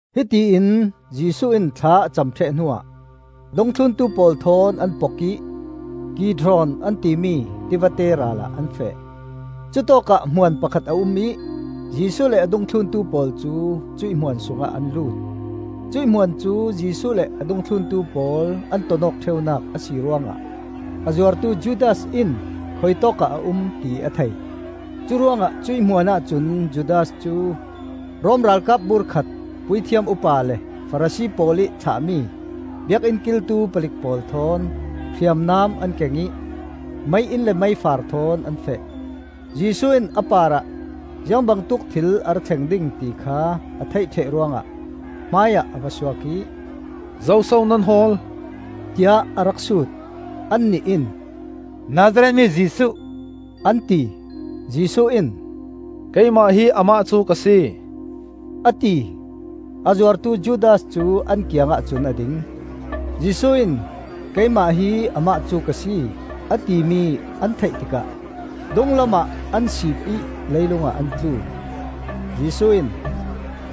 Hitiin Jesuh in thla a cam ṭheh hnuah dungthluntu pawl thawn an pok ih Kidron an timi tivate ral ah an feh. Cutawkah hmuan pakhat a um ih Jesuh le a dungthluntu pawl cu cuih hmuan sungah an lut. Cuih hmuan cu Jesuh le a dungthluntu pawl an ton awk ṭheunak a si ruangah a zuartu Judas in khuitawkah a um ti a thei. Curuangah cuih hmuan ahcun Judas cu Rom ralkap bur khat, puithiam upa le Farasi pawl ih thlahmi Biakinn kiltu palik pawl thawn, hriamnam an keng ih mei-inn le meifar thawn an feh. Jesuh in a parah ziangbangtuk thil a ra thleng ding ti kha a theih ṭheh ruangah hmaiah a va suak ih, “Zoso nan hawl?” tiah a rak sut. Annih in, “Nazareth mi Jesuh,” an ti. Jesuh in, “Keimah hi amah cu ka si,” a ti. A zuartu Judas cu an kiangah cun a ding. Jesuh in, “Keimah hi amah cu ka si,” a timi an theih tikah dunglamah ah siip ih leilungah an tlu. Jesuh in,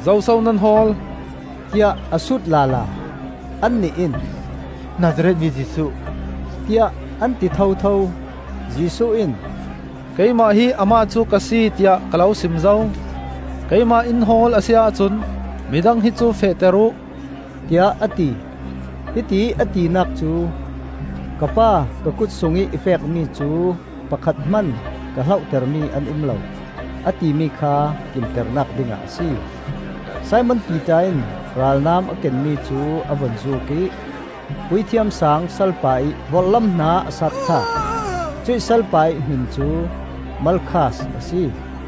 “Zoso nan hawl?” tiah a sut lala. Annih in, “Nazareth mi Jesuh,” tiah an ti thotho. Jesuh in, “Keimah hi amah cu ka si, tiah ka lo sim zo. Keimah in hawl a si ahcun midang hi cu fehter uh,” tiah a ti. Hitiih a tinak cu, “Ka Pa, ka kut sungih i pekmi cu pakhat hman ka hlohtermi an um lo,” a timi kha kimternak dingah a si. Simon Piter in ralnam a kenmi cu a vun zuk ih Puithiam Saang salpa ih vorhlam hna a sat thlak. Cuih salpa ih hmin cu Malkhas a si.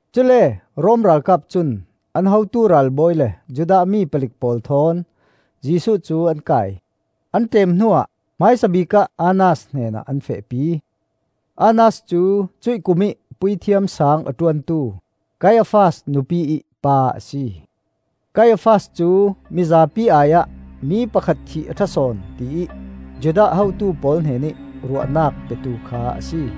Cule Rom ralkap cun an hotu ralbawi le Judah mi palik pawl thawn Jesuh cu an kai; an ṭem hnuah, hmaisabik ah Annas hnenah an fehpi. Annas cu cuih kumih Puithiam Saang a ṭuantu Kaiafas nupi ih pa a si. Kaiafas cu mizapi ai-ah mi pakhat thih a ṭha sawn tiih Judah hotu pawl hnenih ruahnak petu kha a si.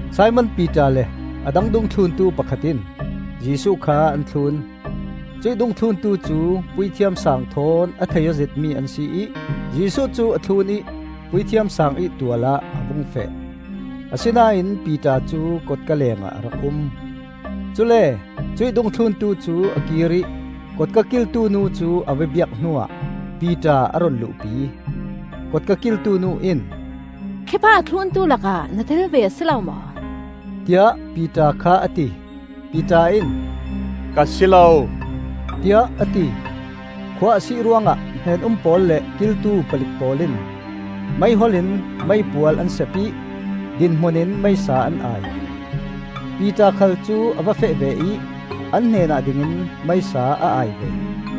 Simon Piter le a dang dungthluntu pakhat in Jesuh kha an thlun. Cuih dungthluntu cu Puithiam Saang thawn a thei aw zetmi an si ih Jesuh cu a thlun ih Puithiam Saang ih tual ah a vung feh. Asinain Piter cu kotka lengah a rak um. Cule cuih dungthluntu cu a kir ih kotka kiltu nu cu a va biak hnuah Piter a run luhpi. Kotka kiltu nu in, “Khi pa a thluntu lakah na tel ve a si lo maw?” tiah Piter kha a ti. Piter in, “Ka si lo,” tiah a ti. Khua a sih ruangah hnen-um pawl le kiltu palik pawl in meihol in meipual an sep ih dinhmunin meisa an ai. Piter khal cu a va feh ve ih an hnenah dingin meisa a ai ve.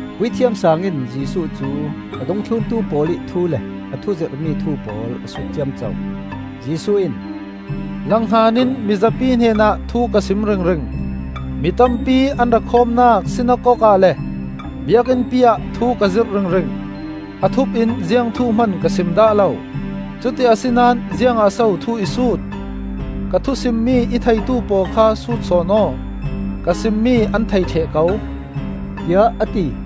Puithiam Saang in Jesuh cu a dungthluntu pawl ih thu le a thuzirhmi thu pawl a sut ciamco. Jesuh in, “Langhnganin mizapi hnenah thu ka sim ringring. Mi tampi an ra khawmnak sinakok ah le Biakinnpi ah thu ka zirh ringring. A thup in ziang thu hman ka sim dah lo. Cuti asinain ziangah so thu i sut? Ka thusimmi i theitu pawl kha sut sawn aw. Ka simmi an thei ṭheh ko,” tiah a ti.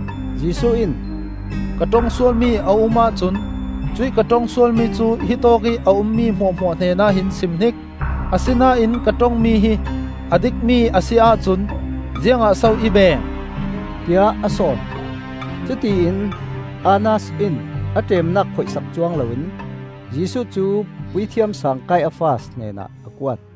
Jesuh in, “Ka ṭongsual mi a um ahcun cuih ka ṭong sualmi cu hitawk ih a ummi hmuahhmuah hnenah hin simhnik! Asinain ka ṭongmi hi a dikmi a si ahcun ziangah so i beng?” tiah a sawn. Cutiin Annas in a ṭemnak phoih sak cuang loin Jesuh cu Puithiam Saang Kaiafas hnenah a kuat.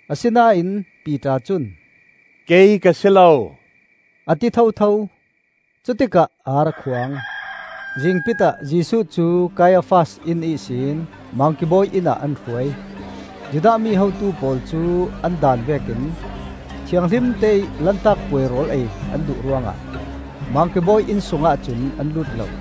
Asinain Piter cun, “Kei ka si lo,” a ti thotho. Cutikah ar a khuang. Zingpit ah Jesuh cu Kaiafas inn ihsin Mangki bawi innah an hruai. Judah mi hotu pawl cu an daan vekin thianghlimte ih Lantak Puai rawl ei an duh ruangah Mangki bawi inn sungah cun an lut lo.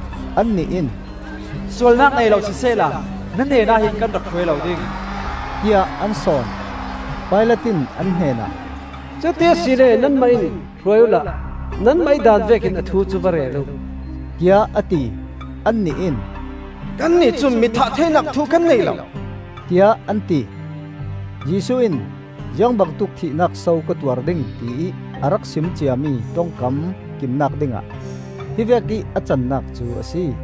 Annih in, “Sualnak nei lo sisehla na hnenah hin kan rak hruai lo ding,” tiah an sawn. Pilat in an hnenah, “Cuti asile nanmah in hruai uhla nanmah ih daan vekin a thu cu va rel uh,” tiah a ti. Annih in, “Kannih cun mithah theinak thu kan nei lo,” tiah an ti. Jesuh in ziangbangtuk thihnak so ka tuar ding ti ih a rak sim ciami ṭongkam kimnak dingah hi vekih a cannak cu a si.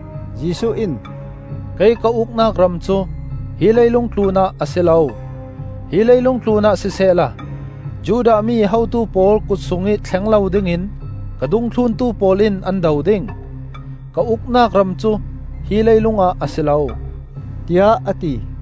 Jesuh in, “Kei ka uknak ram cu hi leilung tlunah a si lo; hi leilung tlunah sisehla Judah mi hotu pawl kut sungih thleng lo dingin ka dungthluntu pawl in an do ding. Ka uknak ram cu hi leilungah a si lo,” tiah a ti.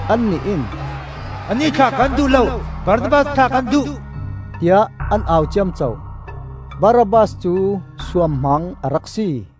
Annih in, “Anih thlah kan duh lo! Barabbas thlah kan duh!” tiah an au ciamco. Barabbas cu suamhmang a rak si.